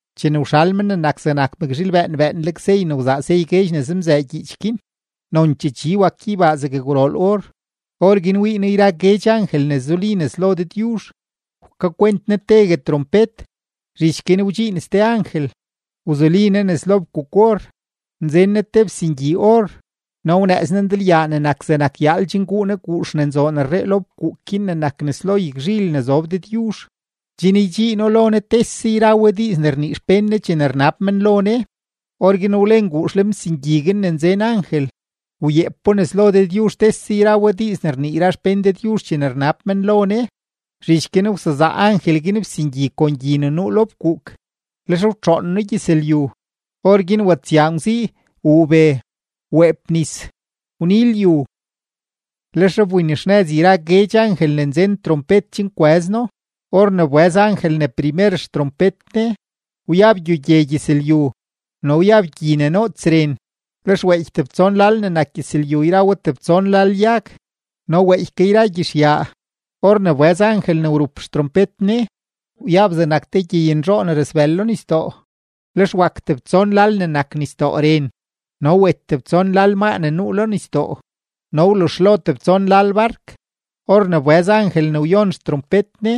Chene wxal Men ne nak zegnak mëkzhiil bëën bëënleg sey ne wzaa sey guedx ne zemzëë gyiich guin, nonchee chi wak gyeybaa zeg gwrool or. Orguin wii noo yra guedx angel ne zuli nes lo Dëdyuzh; wkakwent ne tegue trompet. Zhich guin wdxiin ste angel, wzuli ne nes lo fkuuk-or, nzen ne te fsingyi-or no wnëëz ne ndalyaa ne nak zegnak yaal chen guu ne guux ne nzoon rree lo fkuuk guin ne nak nes lo yagzhil ne zob Dëdyuzh, chen ydxiino lo Ne tese yra we diiz ne rnii xpén Ne chene rnab men lo Ne. Orguin wlen guux lenfsingyi guin ne nzen angel, wyeepo nes lo Dëdyuzh tese yra we diiz ne rnii yra xpén Dëdyuzh chene rnab men lo Ne. Zhich guin wsezaa angel guin fsingyi kon gyi ne nuu lo fkuuk, lex wtxoon no gyëzlyu; orguin watsyaa ngwzii, wuu be, weep nis, wni lyu. Lex wbinxnëz yra guedx angel ne nzen trompet chen kwëz no. Or ne wbëz angel ne primer xtrompet ne, wyab gyogye gyëzlyu no wyab gyi ne noots ren; lex weeky tebtson lal ne nak gyëzlyu yra we tebtson lal yag no weeky ke yra gyizhyaa. Or ne wbëz angel ne wrup xtrompet ne, wyab zegnak te gyeynzhoo ne rasbël lo nisdoo; lex wak tebtson lal ne nak nisdoo ren, no wet tebtson lal maa ne nuu lo nisdoo, no wluzhlo tebtson lal bark. Or ne wbëz angel ne wyon xtrompet ne,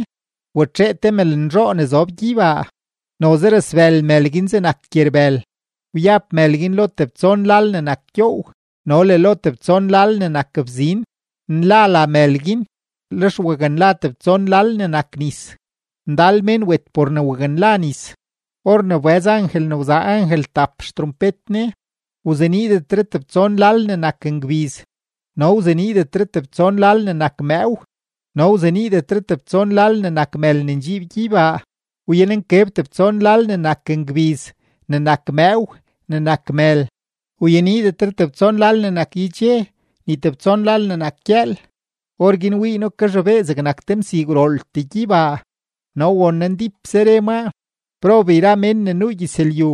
watxee te mëlnzhoo ne zob gyeybaa, noze rasbël mël guin zegnak gyerbël; wyab mël guin lo tebtson lal ne nak gyoow no le lo tebtson lal ne nak bzin. Nla la mël guin; lex waknla tebtson lal ne nak nis; ndal mén wet por ne waknla nis. Or ne wbëz angel ne wzaa angel tap xtrompet ne, wzeniidetre tebtson lal ne nak ngbiz, no wzeniidetre tebtson lal ne nak mëëw, no wzeniidetre tebtson lal ne nak mël ne ndxiib gyeybaa; wyan nkeb tebtson lal ne nak ngbiz, ne nak mëëw, ne nak mël; wyeniidetre tebtson lal ne nak yedxe ni tebtson lal ne nak gyëël. Orguin wii noo kazhobee zegnak te msii gwrooltee gyeybaa no won noo ndípse re maa: ―¡Prob yra mén ne nuu gyëzlyu,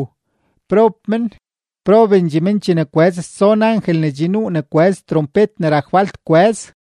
prob men, probendxee men chene kwëz stson angel ne che nuu ne kwëz trompet ne rak falt kwëz!